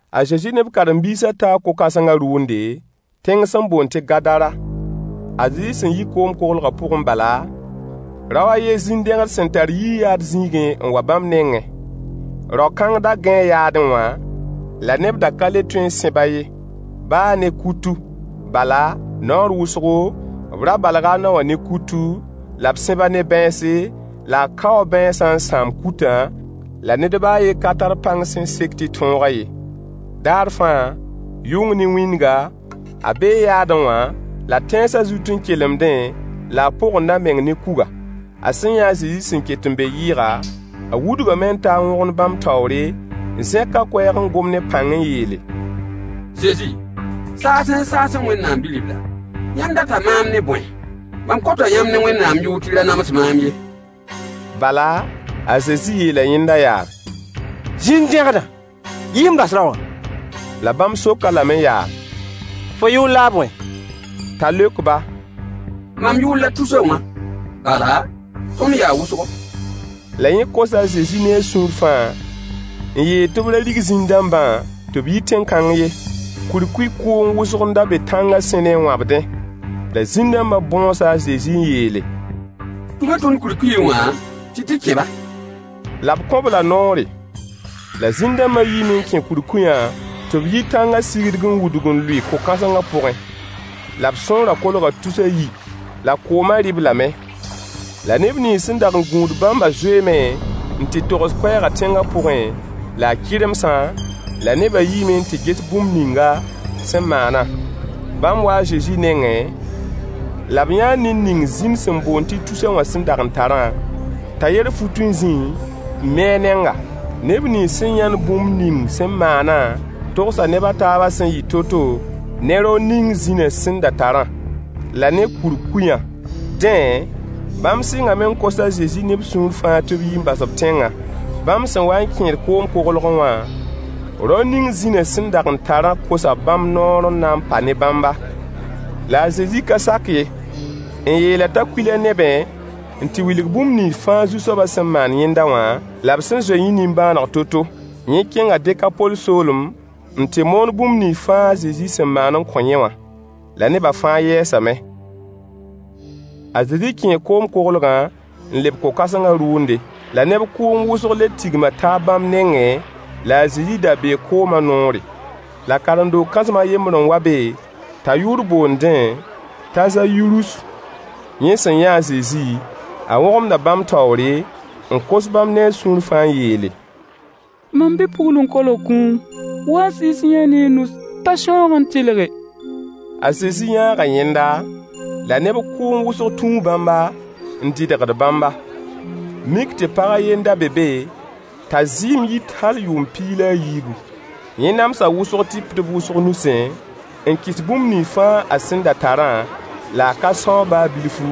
A Zezi ne b karen-biisã taa ko-kãsengã rʋʋnde, tẽng sẽn boond tɩ Gadara. A Zezi sẽn yi koom-koglgã pʋgẽ bala, rao a yen zĩn-dẽgd sẽn tar yii yaad zĩigẽ n wa bãmb nengẽ. Rao-kãng da gãee yaadẽ wã, la neb da ka le tõe n sẽb-a ye, baa ne kutu. Bala, naoor wʋsgo, b ra balga a naowã ne kutu la b sẽb-a ne bãense, la a kaoo bãensã n sãam kutã, la ned baa a yen ka tar pãng sẽn sek tɩ tõog-a ye. Daar fãa, yʋng ne wĩndga, a bee yaadẽ wã la tãensã zut n kelemdẽ la a pogend a meng ne kuga. A sẽn yã a Zezi sẽn ket n be yɩɩga, a wudgame n ta n wõgemd bãmb taoore, n zẽk a koɛɛg n gom ne pãng n yeele: Zezi! Saasẽ-saasẽ Wẽnnaam bi-ribla, yãmb data maam ne bõe? Mam kota yãmb ne Wẽnnaam yʋʋr tɩ y ra nams maam ye. Bala, a Zezi yeela yẽnda yaa: Zĩn-dẽgdã! Yi n bas rao wã. La bãmb sok-a lame yaa: Fo yʋʋr la a bõe? T'a leok-ba: Mam yʋʋr la a Tusa wã, bala, tõnd yaa wʋsgo. La yẽ kosa a Zezi ne a sũur fãa n yeel tɩ b ra rig zĩn-dãmbã tɩ b yi tẽn-kãng ye. Kurkuy kʋʋng wʋsg n da be tãngã sẽne n wãbdẽ. La zĩn-dãmbã bõosa a Zezi n yeele: Tʋm-y tõnd kurkuyẽ wã tɩ d tɩ kẽ-ba. La b kõ-b la noore. La zĩn-dãmba yiime n kẽ kurkuyã tɩ b yi tãngã sigdg n wudg n lʋɩ ko-kãsengã pʋgẽ. La b sõorã kolga tus a yi, la koomã rɩ-b lame. La neb nins sẽn dag n gũud bãmbã zoeeme n tɩ togs koɛɛgã tẽngã pʋgẽ la a kɩremsã, la neba yiime n tɩ ges bũmb ninga sẽn maanã. Bãmb waa a Zezi nengẽ, la b yãa ned ning zĩn sẽn boond tɩ Tusa wã sẽn dag n tarã, t'a yer fut n zĩẽ, n mi a nenga. Neb nins sẽn yãnd bũmb ning sẽn maanã togsa neb a taabã sẽn yɩ to-to ne rao ning zĩna sẽn da tarã, la ne kurkuyã. Dẽ, bãmb sɩngame n kos a Zezi ne b sũur fãa tɩ b yi n bas b tẽngã. Bãmb sẽn wa n kẽed koom-koglgẽ wã, rao ning zĩna sẽn dag n tarã kosa bãmb noor n na n pa ne bãmba. La a Zezi ka sak ye, n yeel-a t'a kuil a nebẽ n tɩ wilg bũmb nins fãa Zu-soabã sẽn maan yẽnda wã, la b sẽn zoe yẽ nimbãaneg to-to. Yẽ kẽnga Dekapol soolem n tɩ moon bũmb nins fãa a Zezi sẽn maan n kõ yẽ wã. La neba fãa yɛɛsame. A Zezi kẽe koom-koglgã n leb ko-kãsengã rʋʋnde. La neb kʋʋng wʋsg le tigma taab bãmb nengẽ, la a Zezi da bee koomã noore. La karen-doog kãsem a yembr n wa be t'a yʋʋr boondẽ t'a Zayirus. Yẽ sẽn yã a Zezi, a wõgemda bãmb taoore, n kos bãmb ne a sũur fãa n yeele: Mam bi-pugl n kolg kũum. Wa-y n sɩɩs-y-yã-a ne y nus t'a sãoog n tɩlge. A Zezi yãaga yẽnda, la neb kʋʋng wʋsg tũu bãmba, n dɩdgd bãmba. Mik tɩ pag a yen n da be be t'a zɩɩm yit hal yʋʋm piig la a yiibu. Yẽ namsa wʋsg tɩpdb wʋsg nusẽ, n kɩs bũmb nins fãa a sẽn da tarã, la a ka sãoog baa bilfu,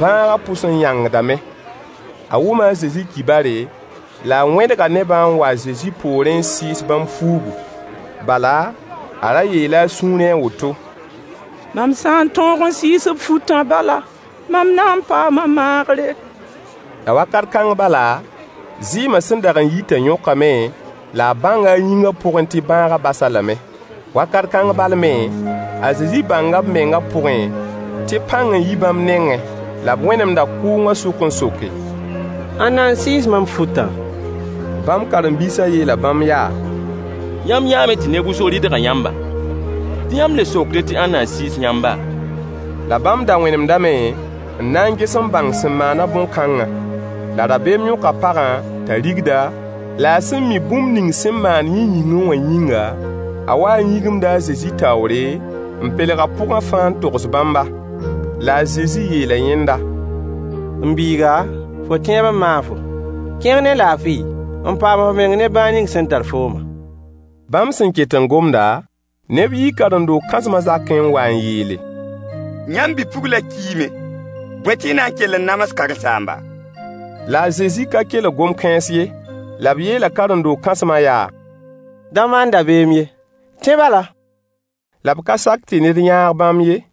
bãagã pʋs n yãngdame. A wʋma a Zezi kibare, la a wẽdga nebã n wa a Zezi poorẽ n sɩɩs bãmb fuugu. Bala, a ra yeela a sũurẽ woto: Mam sã n tõog n sɩɩs b futã bala, mam na n paama maagre. La wakat kãng bala, zɩɩma sẽn dag n yitã yõkame, la a bãnga a yĩngã pʋgẽ tɩ bãagã bas-a lame. Wakat kãng bal me, a Zezi bãnga b mengã pʋgẽ tɩ pãng n yi bãmb nengẽ. La b wẽnemda kʋʋngã sʋk n soke: Ãnna n sɩɩs mam futã? Bãmb karen-biisã yeela bãmb yaa: Yãmb yãame tɩ neb wʋsg rɩdga yãmba, tɩ yãmb le sokdẽ tɩ ãnna n sɩɩs yãmba. La bãmb da wẽnemdame n na n ges n bãng sẽn maan-a bõn-kãngã. La rabeem yõka pagã t'a rigda, la a sẽn mi bũmb ning sẽn maan yẽ yĩngẽ wã yĩnga, a waa n yĩgimda a Zezi taoore, n pelg a pʋgã fãa n togs bãmba. La a Zezi yeela yẽnda: M biiga, fo tẽeb n maag-fo. Kẽng ne laafɩ n paam f meng ne bãag ning sẽn tar foomã. Bãmb sẽn ket n gomda, neb yii karen-doog kãsmã zakẽ n wa n yeele: Yãmb bi-puglã kiime, bõe tɩ y na n kell n nams karen-saamba? La a Zezi ka kelg gom-kãens ye, la b yeela karen-doog kãsmã yaa: Da maan dabeem ye, tẽ bala. La b ka sak tɩ ned yãag bãmb ye,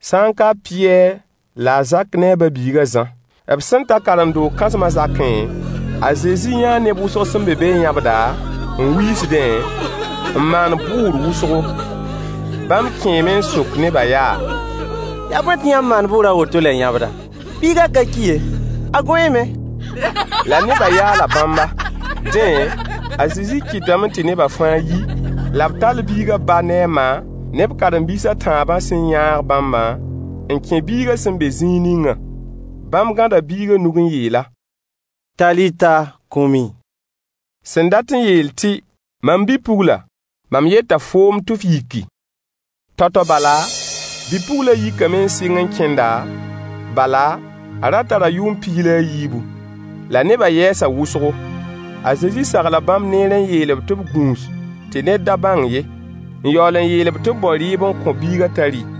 sã n ka a Pɩyɛɛr la a Zak ne a ba-biig a Zã. B sẽn ta karen-doog kãsmã zakẽ, a Zezi yãa neb wʋsg sẽn be be n yãbda, n wiisdẽ, n maand bʋʋr wʋsgo. Bãmb kẽeme n sok neba yaa: Yaa bõe tɩ yãmb maand bʋʋr a woto la y yãbda? Biigã ka ki ye, a gõeeme. La neba yaala bãmba. Dẽ, a Zezi kɩtame tɩ neba fãa yi, la b tall biigã ba ne a ma, ne b karen-biis a tãabã sẽn yãag bãmbã n kẽ biigã sẽn be zĩig ningã. Bãmb gãda biigã nug n yeel-a: “Talita kumi” sẽn dat n yeel tɩ: Mam bi-pugla, mam yeta foom tɩ f yiki. Tao-tao bala, bi-puglã yikame n sɩng n kẽnda, bala, a ra tara yʋʋm piig la a yiibu. La nebã yɛɛsa wʋsgo. A Zezi sagla bãmb neere n yeel-b tɩ b gũus tɩ ned da bãng ye, n yaool n yeel-b tɩ b bao rɩɩb n kõ biigã t'a rɩ.